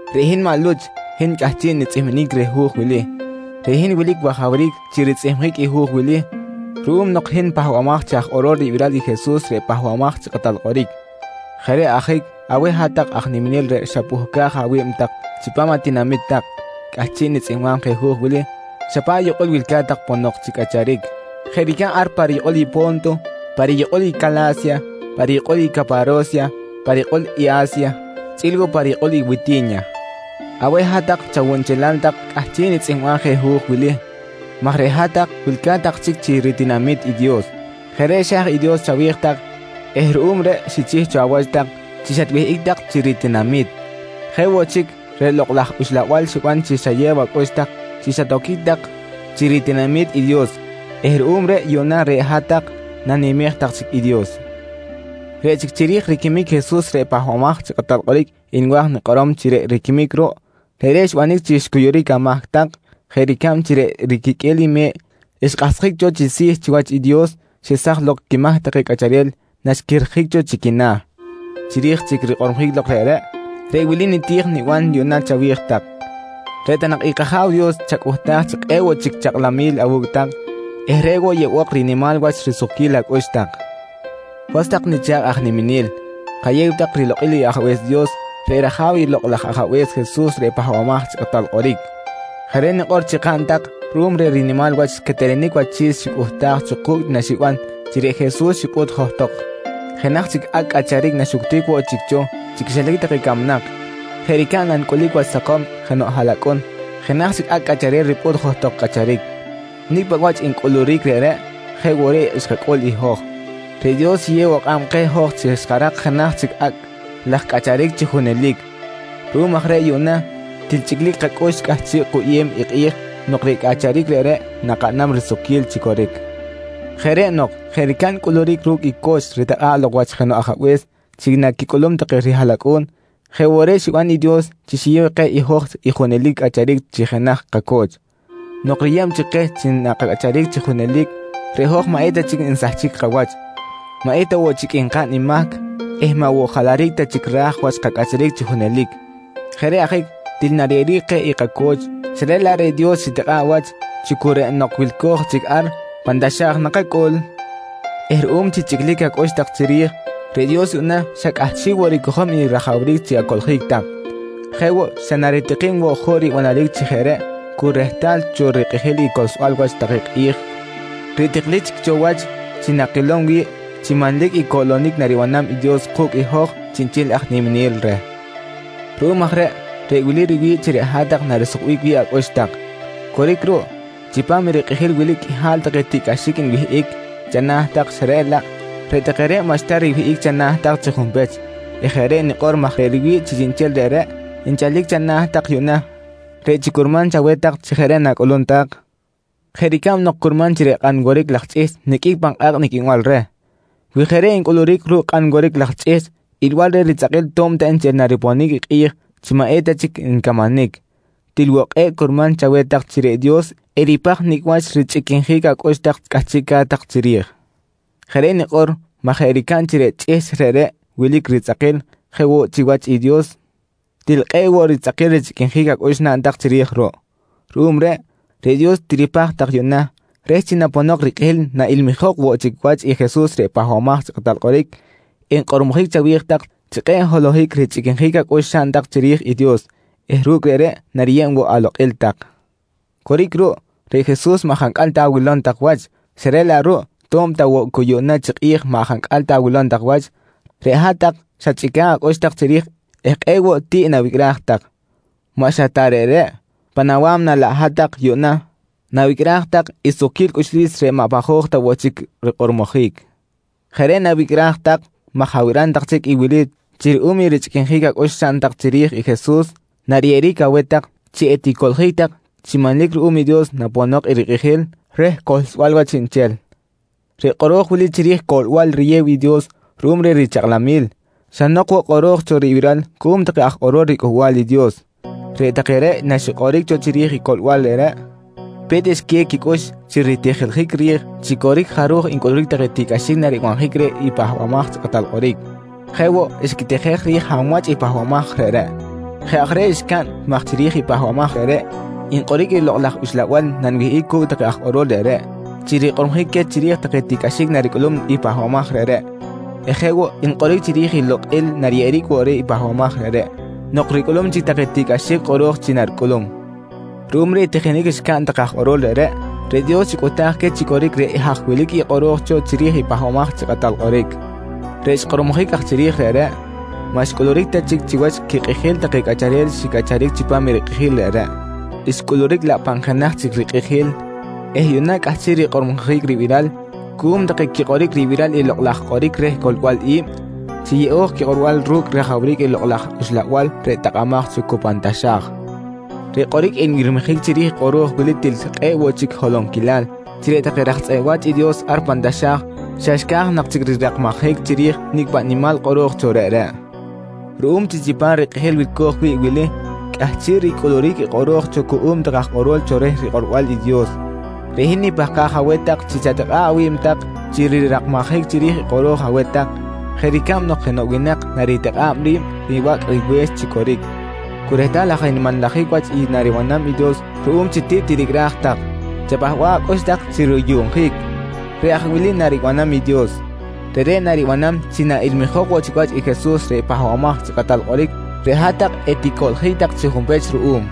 Reꞌ hin maꞌ Luch, hin cꞌahchiꞌ nitzꞌihminic reh i hu̱j wili. Reꞌ hin wilic wajawric chi ritzꞌihmjic i hu̱j wili ruꞌum nok hin pahbamaj chi aj kꞌorol ribiral i Jesus reꞌ Pahbamaj chi Kꞌatal Kꞌoric. Jeꞌ reꞌ ajic aweh hat-tak aj niminel reꞌ xapuhcaj awi̱b tak chipam atinami̱t tak, cꞌahchiꞌ nitzꞌihmbam je hu̱j wili xa paꞌ yukꞌul wilca̱t tak ponok chi cꞌacharic, jeꞌ ricab ar pa riyukꞌul i Po̱nto, pa riyukꞌul i Cala̱sya, pa riyukꞌul i Caparo̱sya, pa riyukꞌul i A̱sya chꞌi̱l woꞌ pa riyukꞌul i Witi̱nya. Aweh hat-tak chawunchelal tak cꞌahchiꞌ nitzꞌihmbam je hu̱j wili maj reꞌ hat-tak wilca̱t tak chic chi ritinami̱t i Dios. Jeꞌ reꞌ xa̱j i Dios chawi̱j tak eh ruꞌum reꞌ xichih cho awach tak chi xatwihꞌic tak chi ritinami̱t. Jeꞌ woꞌ chic reꞌ Lokꞌ laj Uxlabal xiban chi xayew acꞌux tak chi xatoquic tak chi ritinami̱t i Dios eh ruꞌum reꞌ yuꞌna reꞌ hat-tak nanimej tak chic i Dios. Reꞌ chic chiri̱j riquimic i Jesus reꞌ Pahbamaj chi Kꞌatal Kꞌoric nwa̱j nikꞌorom chi reꞌ riquimic ruꞌ, reꞌreꞌ xbanic chi xcuyuric amahc tak jeꞌ ricab chi reꞌ riquiqꞌue̱l i me̱ꞌ xkꞌahsjic cho chi si̱ chiwach i Dios xesaj lok quimahc take cꞌacharel naxquihrjic cho chi quina̱. Chiri̱j chic rikꞌormojic lok reꞌreꞌ, reꞌ wili niti̱j niban yuꞌna chawi̱j tak: Reꞌ ta nak i kAja̱w Dios chacꞌuhtaj chi kꞌe̱ꞌ woꞌ chic chakꞌlamil awu̱cꞌ tak eh reꞌ woꞌ yeꞌbok rinimal wach risukquil acꞌux tak. Was tak nicha̱kꞌ aj niminel, kayew tak rilokꞌil i Ajabe̱s Dios reꞌ rAja̱w i Lokꞌ laj Ajabe̱s Jesus reꞌ Pahbamaj chi Kꞌatal Kꞌoric. Jeꞌ reꞌ nikꞌor chi kaꞌn tak ruꞌum reh rinimal wach quetelenic wachi̱s xicꞌuhtaj cho ku̱cꞌ naxiban chi reꞌ Jesus xipꞌut johtok jenaj chic acꞌ cꞌacharic naxuctic woꞌ chic cho chi quixilac take camnak jeꞌ ricab nancꞌulic wach sakom jenoꞌ haꞌlacꞌun jenaj chic acꞌ cꞌacharel ripꞌut johtok cꞌacharic. Nicꞌ paꞌ wach ncꞌuluric reꞌreꞌ jeꞌ woꞌ reꞌ xkacꞌul i hoj, reꞌ Dios xiyew woꞌ kꞌab keh hoj chi xkarak jenaj chic acꞌ laj cꞌacharic chi junelic. Ruꞌum aj reꞌ yuꞌna til chꞌiclic kacꞌux cꞌahchiꞌ kuyꞌem i kꞌi̱j nok reꞌ cꞌacharic reꞌreꞌ nakaꞌnam risukquil chi coric. Jeꞌ reꞌ nok jeꞌ ricab ncꞌuluric ru̱cꞌ i co̱ch ritikꞌa̱ꞌ lok wach jenoꞌ ajabe̱s chi naquicꞌulum take rihaꞌlacꞌu̱n, jeꞌ woꞌ reꞌ xiban i Dios chi xiyew keh i hoj i junelic cꞌacharic chi jenaj kaco̱ch. Nok riyeb chic keh chi nakacꞌacharic chi junelic, reꞌ hoj maꞌ eta chic nsahchic kawach, maꞌ eta woꞌ chic nkaꞌn i mahc eh maꞌ woꞌ jalaric ta chic ra̱j wach kacꞌacharic chi junelic. Jeꞌ reꞌ ajic til nariyeꞌeric keh i kaco̱ch xa reꞌ laꞌ reꞌ Dios xitikꞌa̱ꞌ wach chi cu reꞌ nok wilco̱j chic ar pan taxa̱j nakacꞌul eh ruꞌum chi chꞌiclic acꞌux tak chiri̱j, reꞌ Dios yuꞌna xa cꞌahchiꞌ woꞌ ricojom i rajawric chi acoꞌljic tak. Jeꞌ woꞌ xa naritikim woꞌ juꞌ ribanaric chi jeꞌ reꞌ cu rehtal cho rikꞌijil i cohlsbal wach take kꞌi̱j reꞌ tiklic chic cho wach chi nakilom wi̱ꞌ chi manlic i coꞌlonic naribanam i Dios ku̱cꞌ hoj chiꞌnchel aj niminel reh. Ruꞌum aj reꞌ, reꞌ wili riwi̱ꞌ chi reꞌ hat-tak narisukbic wi̱ꞌ acꞌux tak. Coric ruꞌ, chipam i rikꞌijil wili qꞌuihal take tiꞌcꞌaxic nwihꞌic chana̱ tak xa reꞌ laꞌ, reꞌ take reꞌ maꞌxta riwihꞌic chana̱ tak chi junpech eh jeꞌ reꞌ nikꞌor maj reꞌ riwi̱ꞌ chi chiꞌnchel reꞌreꞌ nchalic chana̱ tak yuꞌna reꞌ chi curman chaweh tak chi jeꞌ reꞌ nacꞌul tak jeꞌ ricab nok curman chi reꞌ kꞌan woric laj chꞌihchꞌ niqꞌuic pan kꞌa̱kꞌ niqꞌuinbal reh. Wi jeꞌ reꞌ ncꞌuluric ru̱cꞌ kꞌan woric laj chꞌihchꞌ ilbal reh ritzꞌakil to̱b ta nchel nariponic i kꞌi̱j chi maꞌ eta chic ncamanic, til woꞌ kꞌe̱ꞌ curman chaweh tak chi reꞌ Dios eripaj nicꞌ wach richꞌiquinjic acꞌux tak cꞌahchiꞌca̱t tak chiri̱j. Jeꞌ reꞌ nikꞌor maj jeꞌ ricab chi reꞌ chꞌihchꞌ reꞌreꞌ wilic ritzꞌakil jeꞌ woꞌ chiwach i Dios til kꞌe̱ꞌ woꞌ ritzꞌakil richꞌiquinjic acꞌux naꞌn tak chiri̱j ruꞌ. Ruꞌum reꞌ, reꞌ Dios tiripaj tak yuꞌna reh chi naponok rikꞌijil naꞌilmijok woꞌ chic wach i Jesus reꞌ Pahbamaj chi Kꞌatal Kꞌoric, enkꞌormojic chawi̱j tak chi kꞌe̱ꞌ holohic richꞌiquinjic acꞌux xaꞌn tak chiri̱j i Dios eh ru̱cꞌ reꞌreꞌ nariyeb woꞌ alokꞌil tak. Coric ruꞌ, reꞌ Jesus maꞌ jancꞌal ta awilom tak wach xa reꞌ laꞌ ruꞌ to̱b ta woꞌ cu yuꞌna chi kꞌi̱j maꞌ jancꞌal ta awilom tak wach, reꞌ hat-tak xachꞌica̱ꞌ acꞌux tak chiri̱j eh kꞌe̱ꞌ woꞌ tiꞌ nawicꞌraj tak. Maꞌ xa ta reꞌreꞌ, pan awa̱mna laꞌ hat-tak yuꞌna nawicꞌraj tak i sukquil cꞌuxlis reꞌ maꞌ pajoj ta woꞌ chic rikꞌormojic. Jeꞌ reꞌ nawicꞌraj tak maj abiram tak chic i wili chi ruꞌum i richꞌiquinjic acꞌux xaꞌn tak chiri̱j i Jesus nariyeꞌeric aweh tak chi eticoꞌljic tak chi manlic ruꞌum i Dios naponok i rikꞌijil reh cohlsbal wach chiꞌnchel. Reꞌ kꞌoro̱j wili chiri̱j i coꞌlbal riyew i Dios ruꞌum reh richakꞌlamil, xa nok woꞌ kꞌoro̱j cho ribiral cuꞌum take aj kꞌorol riCꞌuhbal i Dios. Reꞌ take reꞌ naxikꞌoric cho chiri̱j i coꞌlbal reꞌreꞌ pe̱t xquiyew quicꞌux chi ritijiljic ri̱j chi coric jaruj encꞌuluric take tiꞌcꞌaxic naribanjic reh i Pahbamaj chi Kꞌatal Kꞌoric. Jeꞌ woꞌ xquitijej ri̱j hab wach i pahbamaj reꞌreꞌ. Jeꞌ aj reꞌ xcaꞌn maj chiri̱j i pahbamaj reꞌreꞌ nkꞌoric i Lokꞌ laj Uxlabal nanwihꞌic cu̱cꞌ take aj kꞌorol reꞌreꞌ chi rikꞌormojic queh chiri̱j take tiꞌcꞌaxic naricꞌulum i pahbamaj reꞌreꞌ eh jeꞌ woꞌ nkꞌoric chiri̱j i lokꞌil nariyeꞌeric woꞌ reh pahbamaj reꞌreꞌ nok ricꞌulum chic take tiꞌcꞌaxic kꞌoro̱j chi naricꞌulum. Ruꞌum reh i tijinic xcaꞌn take aj kꞌoro̱l reꞌreꞌ, reꞌ Dios xicꞌuhtaj queh chi coric reꞌ haj wilic i kꞌoro̱j cho chiri̱j i Pahbamaj chi Kꞌatal Kꞌoric. Reꞌ xkꞌormojic aj chiri̱j reꞌreꞌ, maꞌ xcꞌuluric ta chic chiwach quikꞌijil take cꞌacharel xicꞌacharic chipam i rikꞌijil reꞌreꞌ, xcꞌuluric laꞌ pan jenaj chic rikꞌijil eh yuꞌna cꞌahchiꞌ rikꞌormojic ribiral cuꞌum take quikꞌoric ribiral i lokꞌ laj kꞌoric reh coꞌlbal i̱b chi yeꞌo̱j quikꞌorbal ru̱cꞌ rajawric i Lokꞌ laj Uxlabal reꞌ takꞌamaj cho cu pan taxa̱j. Reꞌ kꞌoric nbirmijic chiri̱j i kꞌoro̱j wili til kꞌe̱ꞌ woꞌ chic holonquilal chi reꞌ take raj tzꞌeꞌ wa̱ch i Dios ar pan taxa̱j xa xca̱j nak chic rirakmajic chiri̱j nicꞌ paꞌ nimal kꞌoro̱j cho reꞌreꞌ. Ruꞌum chi chipam rikꞌijil wilco̱j wi̱ꞌ wili cꞌahchiꞌ ricꞌuluric i kꞌoro̱j cho cuꞌum take aj kꞌorol cho reh rikꞌorbal i Dios, reꞌ hin nipahkaj aweh tak chi chatikꞌa̱ꞌ awi̱b tak chi rirakmajic chiri̱j i kꞌoro̱j aweh tak jeꞌ ricab nok jenoꞌ winak naritikꞌa̱ꞌ ri̱b ribacꞌ riwe̱x chi coric. Cu rehtal aj nmanlajic wach i naribanam i Dios ruꞌum chi tiꞌ tiricꞌraj tak, chapahba̱ꞌ acꞌux tak chi ruyuꞌnjic. Reꞌ aj wili naribanam i Dios: Reꞌreꞌ naribanam chi naꞌilmijok woꞌ chic wach i Jesus reꞌ Pahbamaj chi Kꞌatal Kꞌoric reꞌ hat-tak eticoꞌljic tak chi junpech ruꞌum.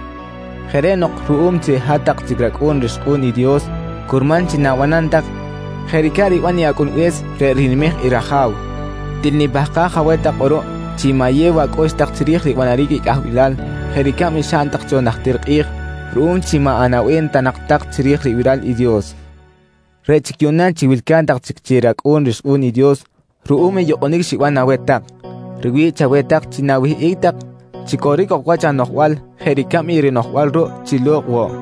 Jeꞌ reꞌ nok ruꞌum chi hat-tak chic racꞌu̱n rixkꞌu̱n i Dios, curman chi na̱banam tak jeꞌ ricab riban i acꞌunbe̱s reꞌ rinimej i raja̱w. Til nipahkaj aweh tak kꞌuruꞌ chi ma̱yew acꞌux tak chiri̱j ribanaric i cꞌahbilal jeꞌ ricab xaꞌn tak cho najtir kꞌi̱j ruꞌum chi maꞌ anaꞌbem ta nak tak chiri̱j ribiral i Dios. Reꞌ chic yuꞌna chi wilca̱t tak chic chi racꞌu̱n rixkꞌu̱n i Dios ruꞌum i yukꞌunic xiban aweh tak, riwi̱ꞌ chaweh tak chi na̱wihꞌic tak chi coric ok wach anoꞌjbal jeꞌ ricab i rinoꞌjbal ruꞌ chi lo̱kꞌ woꞌ.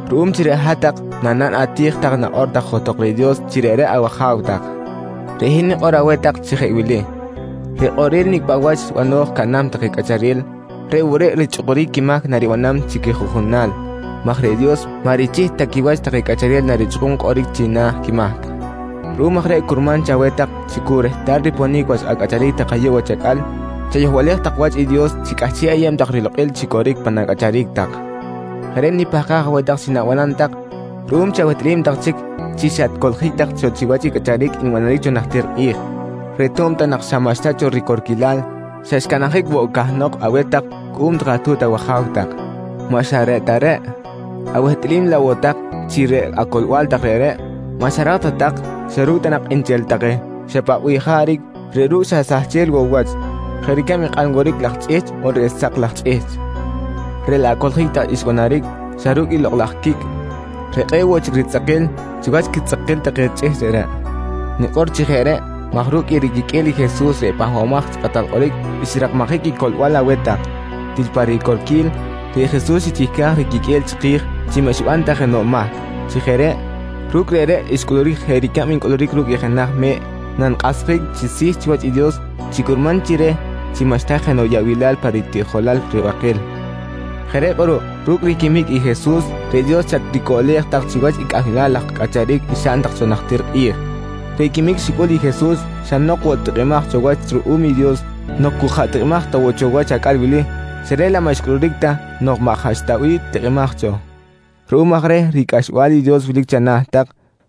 Ruꞌum chi reꞌ hat-tak nanaꞌn ati̱j tak nakꞌor tak johtok reh Dios chi reꞌreꞌ awAja̱w tak, reꞌ hin nikꞌor aweh tak chi jeꞌ wili: Reꞌ kꞌorel nicꞌ paꞌ wach bano̱j caꞌnam take cꞌacharel, reꞌ woꞌ reꞌ richꞌukuric quimahc naribanam chi quijuꞌjunal maj reꞌ Dios maꞌ richih ta quiwach take cꞌacharel narichꞌukum kꞌoric china̱ quimahc. Ruꞌum aj reꞌ curman chaweh tak chi cu rehtal riponic wach acꞌacharic tak ayuꞌ wach acꞌal, chayohbalej wach i Dios chi cꞌahchiꞌ ayeb tak rilokꞌil chi coric pan acꞌacharic tak. Jeꞌ reꞌ nipahkaj aweh tak chi na̱banam tak ruꞌum chi awehtꞌalim tak chic chi xatcoꞌljic tak cho chiwach i cꞌacharic nbanaric cho najtir kꞌi̱j, reꞌ to̱b ta nak xa maꞌxta cho ricorquilal xa xcanabjic woꞌ cahnok aweh tak cuꞌum atu̱t awaja̱w tak. Maꞌ xa reꞌ ta reꞌ, awehtꞌalim laꞌ woꞌ tak chi reꞌ acoꞌlbal tak reꞌreꞌ, maꞌ xarak ta tak xa ru̱cꞌ ta nak nchel take xa paꞌ bih jaric reꞌ ru̱cꞌ xa sahchel woꞌ wach, jeꞌ ricab i kꞌan woric laj chꞌihchꞌ on reꞌ sak laj chꞌihchꞌ, reꞌ laꞌ acoꞌljic tak xbanaric xa ru̱cꞌ i lokꞌ laj quicꞌ reꞌ kꞌe̱ꞌ woꞌ chic ritzꞌakil chiwach quitzꞌakil take chꞌihchꞌ reꞌreꞌ. Nikꞌor chi jeꞌ reꞌ maj ru̱cꞌ i riquiqꞌue̱l i Jesus reꞌ Pahbamaj chi Kꞌatal Kꞌoric xrakmajic i coꞌlbal aweh tak. Til pa ricorquil, reꞌ Jesus xichihcaj riquiqꞌue̱l chiki̱j chi maꞌ xiban ta jenoꞌ mahc. Chi jeꞌ reꞌ, ru̱cꞌ reꞌreꞌ xcꞌuluric jeꞌ ricab ncꞌuluric ru̱cꞌ i jenaj me̱ꞌ nankꞌahsjic chi si̱ chiwach i Dios chi curman chi reh chi maꞌxta jenoꞌ yaꞌbilal pa ritiꞌjolal ribakil. Jeꞌ reꞌ kꞌuruꞌ ru̱cꞌ riquimic i Jesus reꞌ Dios xatricoꞌlej tak chiwach cꞌahbil laj cꞌacharic xaꞌn tak cho najtir kꞌi̱j. Reꞌ quimic xicꞌul i Jesus xa nok woꞌ tikꞌimaj cho wach ruꞌum i Dios nok cu jaꞌ tikꞌimaj ta woꞌ cho wach acꞌal wili xa reꞌ laꞌ maꞌ xcꞌuluric ta nok maꞌ jaꞌ xta bih tikꞌimaj cho. Ruꞌum aj reh ricꞌaxbal i Dios wilic chana̱ tak,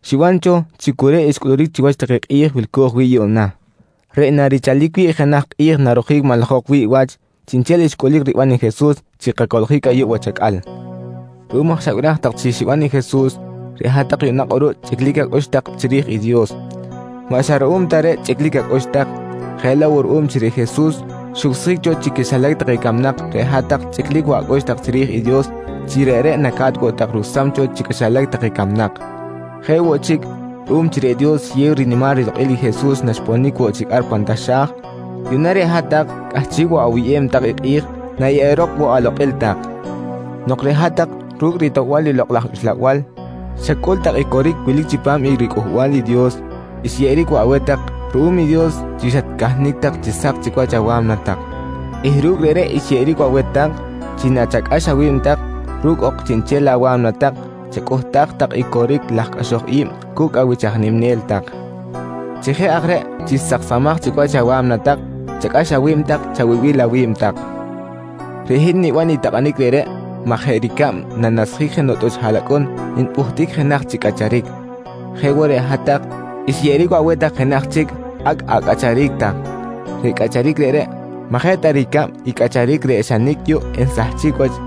xiban cho chi cu reꞌ xcꞌuluric chiwach take kꞌi̱j wilco̱j wi̱ꞌ yuꞌna, reꞌ narichalic wi̱ꞌ jenaj kꞌi̱j narojic manlajok wi̱ꞌ wach chiꞌnchel xcꞌulic riban i Jesus chi kacoꞌljic ayuꞌ wach acꞌal. Ruꞌum aj xabiraj tak chi xiban i Jesus, reꞌ hat-tak yuꞌna kꞌuruꞌ chꞌiclic acꞌux tak chiri̱j i Dios. Maꞌ xa ruꞌum ta reꞌ chꞌiclic acꞌux tak, jeꞌ laꞌ woꞌ ruꞌum chi reꞌ Jesus xucsjic cho chi quixilac take camnak reꞌ hat-tak chꞌiclic woꞌ acꞌux tak chiri̱j i Dios chi reꞌreꞌ naca̱t woꞌ tak rucsam cho chi quixilac take camnak. Jeꞌ woꞌ chic, ruꞌum chi reꞌ Dios xiyew rinimal rilokꞌil i Jesus naxponic woꞌ chic ar pan taxa̱j, yuꞌna reꞌ hat-tak cꞌahchiꞌ woꞌ awuyꞌem tak i kꞌi̱j nayeꞌerok woꞌ alokꞌil tak. Nok reꞌ hat-tak ru̱cꞌ ritoꞌbal i Lokꞌ laj Uxlabal xacꞌul tak i coric wilic chipam i riCꞌuhbal i Dios, xyeꞌeric woꞌ aweh tak ruꞌum i Dios chi xatcahnic tak chi sak chic wach awa̱mna tak eh ru̱cꞌ reꞌreꞌ xyeꞌeric woꞌ aweh tak chi nachacꞌax awi̱b tak ru̱cꞌ ok chiꞌnchel awa̱mna tak chacꞌuhtaj tak i coric laj cꞌaxoj i̱b cu̱cꞌ awich aj niminel tak. Chi jeꞌ aj reꞌ chi saksamaj chic wach awa̱mna tak chacꞌax awi̱b chawibil awi̱b tak. Reꞌ hin niban i takꞌanic reꞌreꞌ maj jeꞌ ricab nanasjic jenoꞌ tꞌuch haꞌlacꞌun npꞌuhtic jenaj chic cꞌacharic, jeꞌ woꞌ reꞌ hat-tak xyeꞌeric woꞌ aweh tak jenaj chic acꞌ acꞌacharic tak. Reꞌ cꞌacharic reꞌreꞌ maꞌ jeꞌ ta ricab i cꞌacharic reꞌ xa nicꞌ yuꞌ ensahchic wach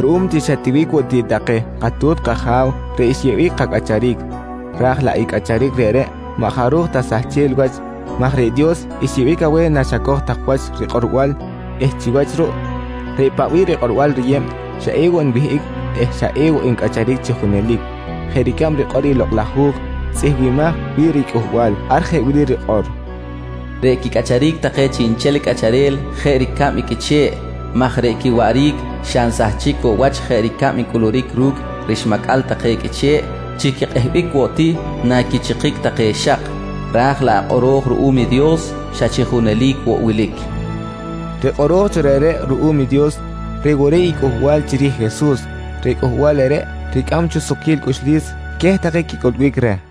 ruꞌum chi xa tiwic woꞌ ti take katu̱t kaja̱w reꞌ xiyeꞌbic kacꞌacharic, ra̱j laꞌ i cꞌacharic reꞌreꞌ maꞌ jaruj ta sahchel wach maj reꞌ Dios xyeꞌbic aweh naxacoj tak wach rikꞌorbal eh chiwach ruꞌ reꞌ paꞌ bih rikꞌorbal riyeb xa ewoꞌ nwihꞌic eh xa ewoꞌ ncꞌacharic chi junelic jeꞌ ricab rikꞌor i Lokꞌ laj Hu̱j tzꞌihmbimaj wi̱ꞌ riCꞌuhbal. Ar jeꞌ wili rikꞌor: “Reꞌ quicꞌacharic take chiꞌnchel cꞌacharel jeꞌ ricab i qꞌuiche̱ꞌ maj reꞌ quiwaꞌric xa nsahchic woꞌ wach jeꞌ ricab ncꞌuluric ru̱cꞌ rixmacꞌal take qꞌuiche̱ꞌ chi quikꞌehbic woꞌ ti naquichikic take xak. Ra̱j laꞌ i kꞌoro̱j ruꞌum i Dios xa chi junelic woꞌ wilic, nqui rikꞌor. Reꞌ kꞌoro̱j cho reꞌreꞌ ruꞌum i Dios, reꞌ woꞌ reꞌ i cꞌuhbal chiri̱j i Jesus. Reꞌ cꞌuhbal reꞌreꞌ ricꞌam cho sukquil cꞌuxlis queh take quicꞌulbic reh.